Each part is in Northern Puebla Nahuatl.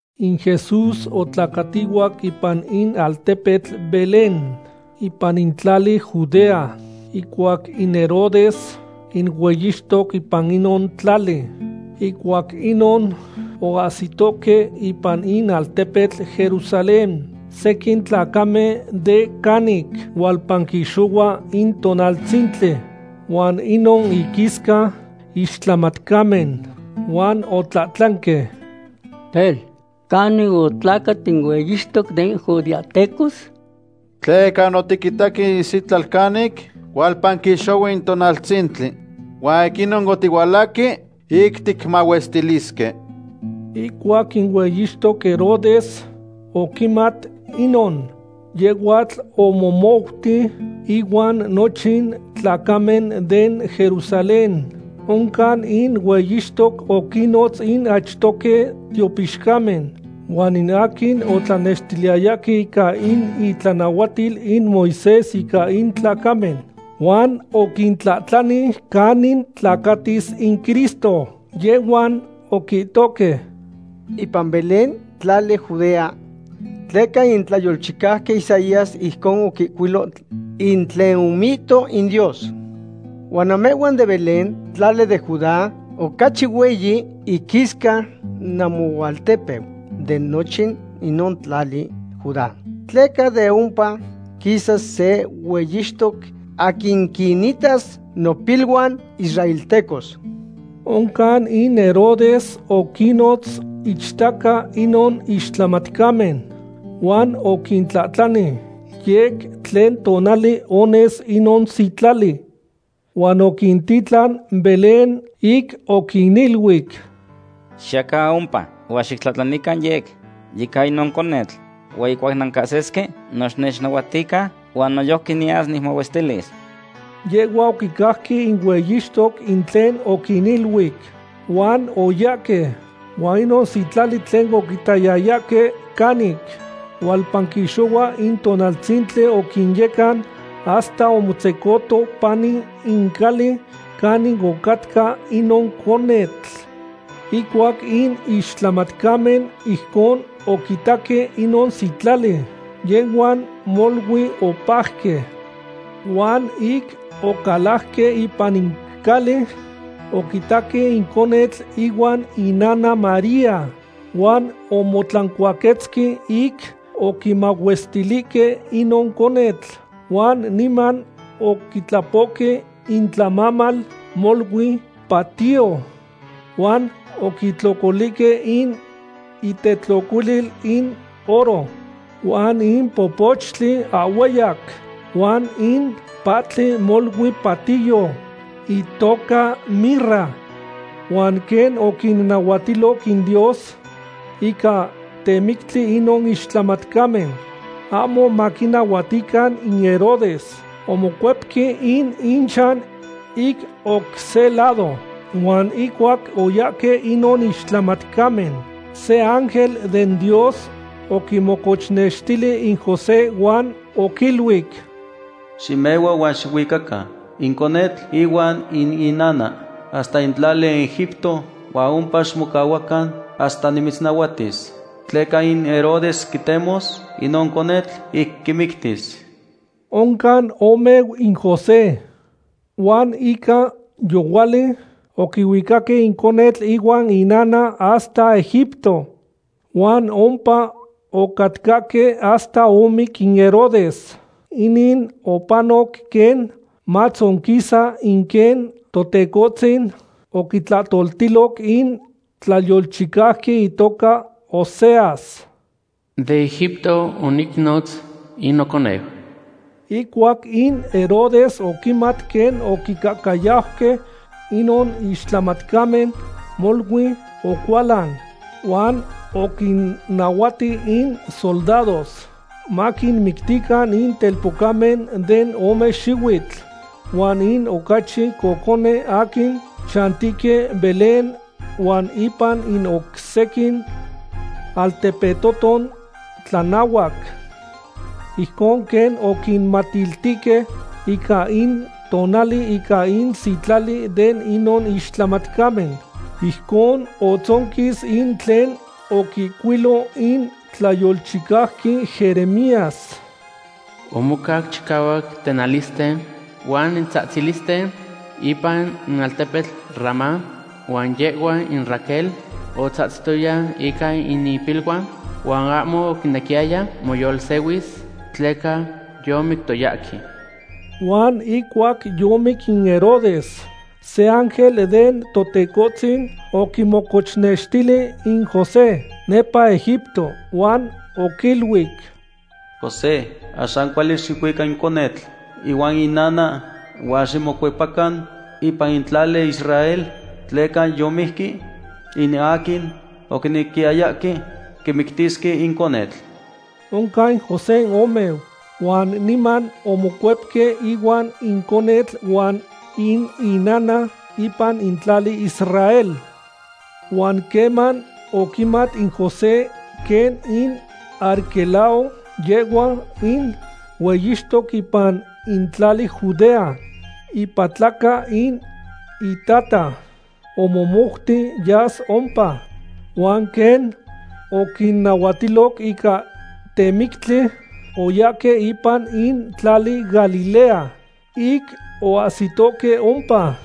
In Jesús otlacatihuac ipan in altepetl Belén, ipan in tlali Judea, ihcuac in Herodes in hueyixtoc ipan inon tlali. Ihcuac inon oahsitohque ipan in altepetl Jerusalén sequin tlacamen de canic hualpanquixohua in tonaltzintli, huan inon inquisca ixtlamatcamen. Huan otlahtlanque: ―Tel, ¿canin otlacat in hueyixtoc den judeahtecos? Tleca otiquitaque in isitlal canic hualpanquixohua in tonaltzintli, huan ic inon otihualahque ic ticmahuestilisque. Ihcuac in hueyixtoc Herodes oquimat inon, yehhuatl omomouti, ihuan nochin tlacamen den Jerusalén. Oncan in hueyixtoc oquinnotz in achtohque tiopixcamen huan in aquin otlanextiliyayahque ica in itlanahuatil in Moisés ica in tlacamen, huan oquintlahtlani canin tlacatis in Cristo. Yehhuan oquihtohque: ―Ipan Belén, tlali Judea; tleca in tlayolchicauqui Isaías ijcon oquihcuilo in tlen omihto in Dios: Huan namehhuan den Belén, tlali den Judá, ocachi hueyi iquisca namoaltepeu de nochin inon tlali Judá, tleca de ompa quisas se hueyixtoc, aquin quinitas nopiluan israeltecos. Oncan in Herodes oquinnotz ichtaca inon ixtlamatcamen, huan oquintlahtlani yec tlen tonali ones inon sitlali. Huan oquintitlan Belén, ic oquiniluic: ―Xiyacan ompa huan xitlahtlanican yec ica inon conetl. Huan ihcuac nancahsisque, no xinechnahuatican, huan noyojqui niyas nicmahuestilis. Yehhuan oquicajque in hueyixtoc in tlen oquiniluic, huan oyahque. Huan inon sitlali tlen oquitayayahque canic hualpanquixohua in tonaltzintli oquinyecan hasta omotzecoto pani in cali canin ocatca inon conetl. Ihcuac in ixtlamatcamen ijcon oquitaque inon sitlali, yehhuan molui opajque. Huan ic ocalajque ipan in cali, oquitaque in conetl ihuan inana María. Huan omotlancuaquetzque ic oquimahuestilihque inon conetl. Huan niman oquitlapohque intlamamal molui patiyo huan oquitlocolihque in itetlocolil in oro, huan in popochtli ahhueyac, huan in pahtli molui patiyo, itoca mirra. Huan quen oquinnahuatiloc in Dios ica temictli inon ixtlamatcamen, ahmo maquinahuatican in Herodes, omocuepque in inchan ic oc se lado. Huan ihcuac oyahque inon ixtlamatcamen, se ángel den Dios oquimocochnextili in José huan oquiluic: ―Ximehua huan xicuicacan in conetl ihuan in inana hasta in tlali Egipto, huan ompa ximocahuacan hasta nimitznahuatis. Tleca in Herodes quitemos inon conetl ic quimictis. Oncan omeu in José, huan ica yohuali oquihuicaque in conetl ihuan inana hasta Egipto. Huan ompa ocatcahque hasta omic in Herodes. Inin opanoc quen matzonquisa in quen Totecohtzin oquitlahtoltiloc in tlayolchicauqui itoca Oseas: “De Egipto onicnotz in noconeu.” Ihcuac in Herodes oquimat quen oquicahcayauque inon ixtlamatcamen, molui ocualan, huan oquinnahuati in soldados maquinmictican in telpocamen de ome xihuitl huan in ocachi cocone aquin chantihque Belén huan ipan in oc sequin altepetoton tlanahuac. Ijcon quen oquimatiltihque ica in tonali ica in sitlali de inon ixtlamatcamen. Ijcon otzonquis in tlen oquihcuilo in tlayolchicauqui Jeremías: Omocac chicahuac tenalisten huan tzahtzilisten ipan in altepetl Ramá, huan yehhua in Raquel otzahtzitoya ica in ipiluan, huan ahmo oquinequiyaya moyolsehuis, tleca yomictoyahque. Huan ihcuac yomic in Herodes, se ángel den Totecohtzin oquimocochnextili in José nepa Egipto, huan oquiluic: ―José, axan cuali xicuica in conetl ihuan inana, huan ximocuepacan ipan in tlali Israel, tleca yomijqui in aquin oquinequiyayahque quimictisque in conetl. Oncan in José omeu, huan niman omocuepque ihuan in conetl huan in inana, ipan in tlali Israel. Huan queman oquimat in José quen in Arquelao yehhua in hueyixtoc ipan in tlali Judea, ipatlaca in itata, omomouti yas ompa. Huan quen oquinahuatiloc ica temictli, oyahque ipan in tlali Galilea. Ic oahsitohque ompa,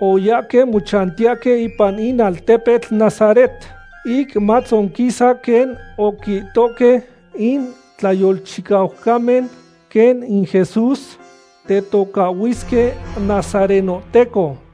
oyahque mochantiyahque ipan in altepetl Nazaret, ic matzonquisa quen oquihtohque in tlayolchicaucamen, quen in Jesús tetocahhuisque nazarenohteco.